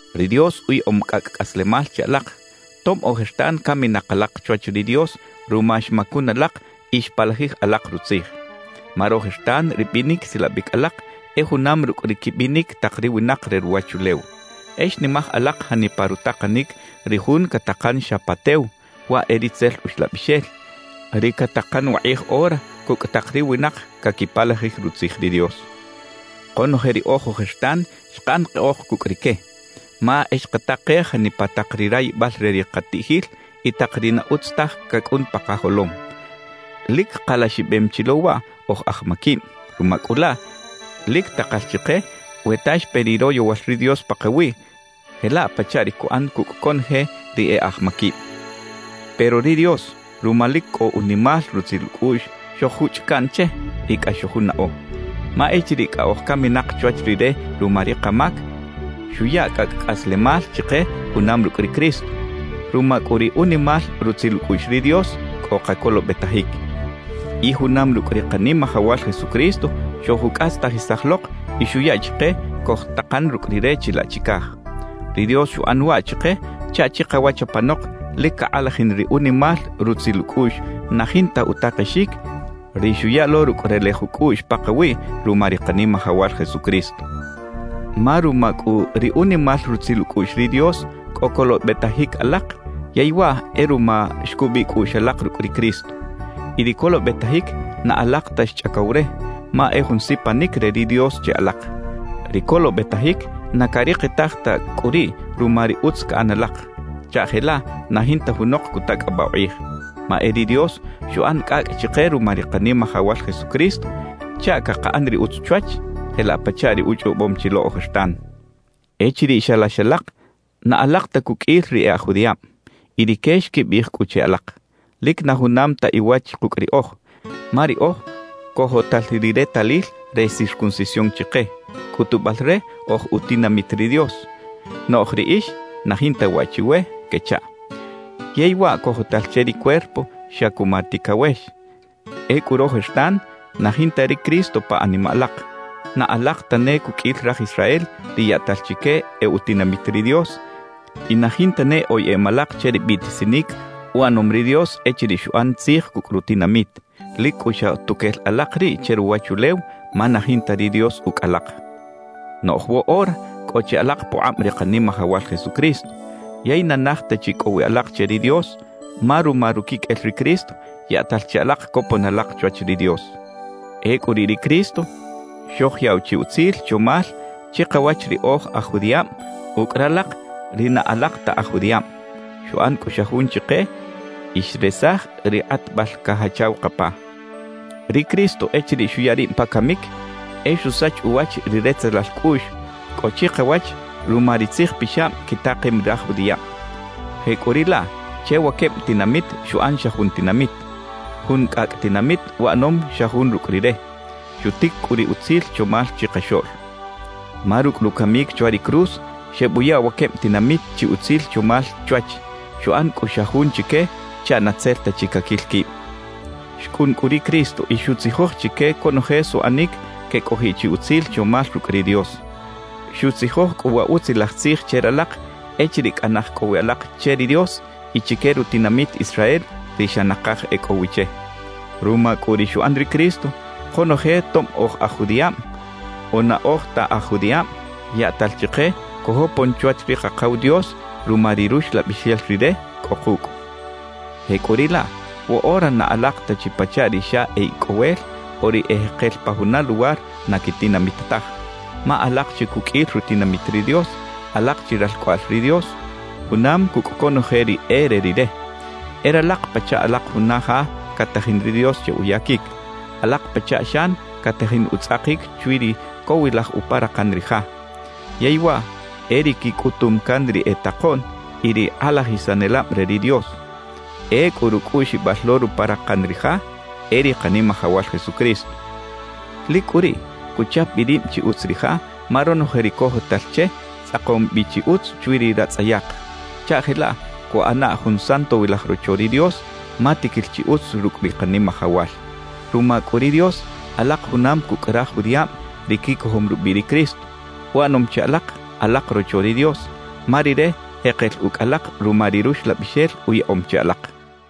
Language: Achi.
Ri Dios uyaꞌom cꞌacꞌ cꞌaslemal che alak, tob ojertan caminak alak chwach ri Dios ruma xmacun alak y xpalajij alak Rutzij. Ma rojertan ri binic silabic alak e junam rucꞌ ri quibinic tak ri winak re ruwachulew. E xnimaj alak janipa rutakanic ri jun catakan xa pa tew, waꞌ e ri itzel uxlabixel, ri catakan wakꞌij ora cucꞌ tak ri winak caquipalajij Rutzij ri Dios. Konoje riꞌoj ojertan xkaꞌan keꞌoj cucꞌ rique, ma e xkatakej janipa tak ri rayibal re ri katiꞌjil y tak ri na utz taj cacꞌun pa kajolom. Lic kalaxibem chi lo waꞌ oj aj maquib. Ruma cꞌu laꞌ, lic takal chike we ta xpe ri royowal ri Dios pakawiꞌ jelaꞌ pachaꞌ ri cuꞌan cucꞌ conoje ri e aj maquib. Pero ri Dios ruma lic cꞌo unimal rutzil ucꞌuꞌx, xoj-juchꞌ caꞌn che y cꞌax xojunaꞌo. Ma echiriꞌ cꞌa oj caminak chwach Rire ruma ri kamac, xuya cꞌacꞌ cꞌaslemal chike junam rucꞌ ri Cristo. Ruma cꞌu ri unimal rutzil ucꞌuꞌx ri Dios cꞌo kacolobetajic. Y junam rucꞌ ri Kanimajawal Jesucristo xojucꞌastajisaj lok y xuya chike cojtakan rucꞌ Rire chilaꞌ chicaj. Ri Dios xuꞌan waꞌ chike chaꞌ chikawach apanok lic cakꞌalajin ri unimal rutzil ucꞌuꞌx na jinta utakexic, ri xuya lo rucꞌ relej ucꞌuꞌx pakawiꞌ ruma ri Kanimajawal Jesucristo. Ma ruma cꞌu ri unimal rutzil ucꞌuꞌx ri Dios cꞌo colobetajic alak yey waꞌ e ruma xcubiꞌ cꞌuꞌx alak rucꞌ ri Cristo. Y ri colobetajic, na alak ta xchꞌacow re, ma e jun sipanic re ri Dios che alak. Ri colobetajic na carikitaj ta cꞌu riꞌ ruma ri utz caꞌan alak, chaꞌ jelaꞌ na jinta junok cutacꞌabaꞌ ukꞌij. Ma e ri Dios xuꞌan cꞌacꞌ chike ruma ri Kanimajawal Jesucristo chaꞌ cakaꞌan ri utz chwach jelaꞌ pachaꞌ ri uchꞌobom chi lo ojertan. Echiriꞌ xalax alak, na alak ta cuqꞌuil ri e aj judiꞌab. Y rique xquibiꞌij cꞌu che alak: «Lic na junam ta iwach kucꞌ riꞌoj, ma riꞌoj cojotal ri retalil re circuncisión chike, cꞌutubal re oj utinamit ri Dios; noꞌj riꞌix na jinta waꞌ chiwe» quechaꞌ. Yey waꞌ cojotal che ri cuerpo xa cuma ticawex. Ecꞌu rojertan na jinta ri Cristo pa animaꞌ alak, na alak ta ne cuqꞌuil raj Israel ri yaꞌtal chique e utinamit ri Dios, y na jinta ne oyeꞌem alak che ri biꞌtisinic uꞌanom ri Dios echiriꞌ xuꞌan tzij cucꞌ rutinamit; lic cꞌu xa tuquel alak riꞌ che ruwachulew ma na jinta ri Dios ucꞌ alak. Noꞌj woꞌora cꞌo chi alak pukꞌab ri Kanimajawal Jesucristo; yey na naj ta chi cꞌo wi alak che ri Dios, ma ruma ruquiqꞌuel ri Cristo, yaꞌtal che alak copon alak chwach ri Dios. Ecꞌu riꞌ ri Cristo xojyaꞌw chi utzil chomal chikawach ri oj aj judiꞌab ucꞌ ralak ri na alak ta aj judiꞌab; xuꞌan cꞌu xa jun chike y xresaj ri kꞌatbal cajachaw kapa. Ri Cristo echiriꞌ xuya rib pa camic, e xusach uwach ri retzelal cꞌuꞌx cꞌo chikawach ruma ri tzij pixab quitakem raj judiꞌab. Jecꞌuriꞌlaꞌ, che wa queb tinamit xuꞌan xa jun tinamit, jun cꞌacꞌ tinamit uꞌanom xa jun rucꞌ Rire. Xutic cꞌu ri utzil chomal chikaxoꞌl. Ma rucꞌ rucamic chwa ri cruz, xebuya wa queb tinamit chi utzil chomal chwach; xuꞌan cꞌu xa jun chique chaꞌ na tzel ta chi caquil quib. Xcꞌun cꞌu ri Cristo y xutzijoj chique conoje suꞌanic quecꞌojiꞌ chi utzil chomal rucꞌ ri Dios. Xutzijoj cꞌu wa Utzilaj Tzij che ralak echiriꞌ cꞌa naj cꞌo wi alak che ri Dios y chique rutinamit Israel ri xa nakaj e cꞌo wi che. Ruma cꞌu ri xuꞌan ri Cristo, konoje tob oj aj judiꞌab o na oj ta aj judiꞌab yaꞌtal chike cojopon chwach ri Kakaw Dios ruma ri Ruxlabixel Rire cꞌo kucꞌ. Jecꞌuriꞌlaꞌ, woꞌora na alak ta chi pachaꞌ ri xa e icꞌowel o ri e jekel pa juna luwar na quitinamit taj; ma alak chi cuqꞌuil rutinamit ri Dios, alak chi ralcꞌoꞌal ri Dios, junam cucꞌ conoje ri e re Rire. E ralak pachaꞌ alak juna ja catajin ri Dios che uyaquic. Alak pachaꞌ xan catajin utzꞌakic chwi ri cowilaj uparakan ri ja, yey waꞌ e ri quicꞌutum can ri e takoꞌn y ri kꞌalajisanelab re ri Dios. Ecꞌu rucꞌuꞌxibal lo ruparakan ri ja e ri Kanimajawal Jesucristo. Lic cꞌu riꞌ cuchap bi rib chi utz ri ja ma ronoje ri cojotal che, tzꞌakom bi chi utz chwi ri ratzꞌayak, chaꞌ jelaꞌ cuꞌana jun santowilaj rocho ri Dios, ma tiquil chi utz rucꞌ ri Kanimajawal. Ruma cꞌu ri Dios, alak junam cucꞌ raj judiꞌab ri quicojom rubiꞌ ri Cristo; uꞌanom che alak, alak rocho ri Dios, ma Rire jekel ucꞌ alak ruma ri Ruxlabixel uyaꞌom che alak.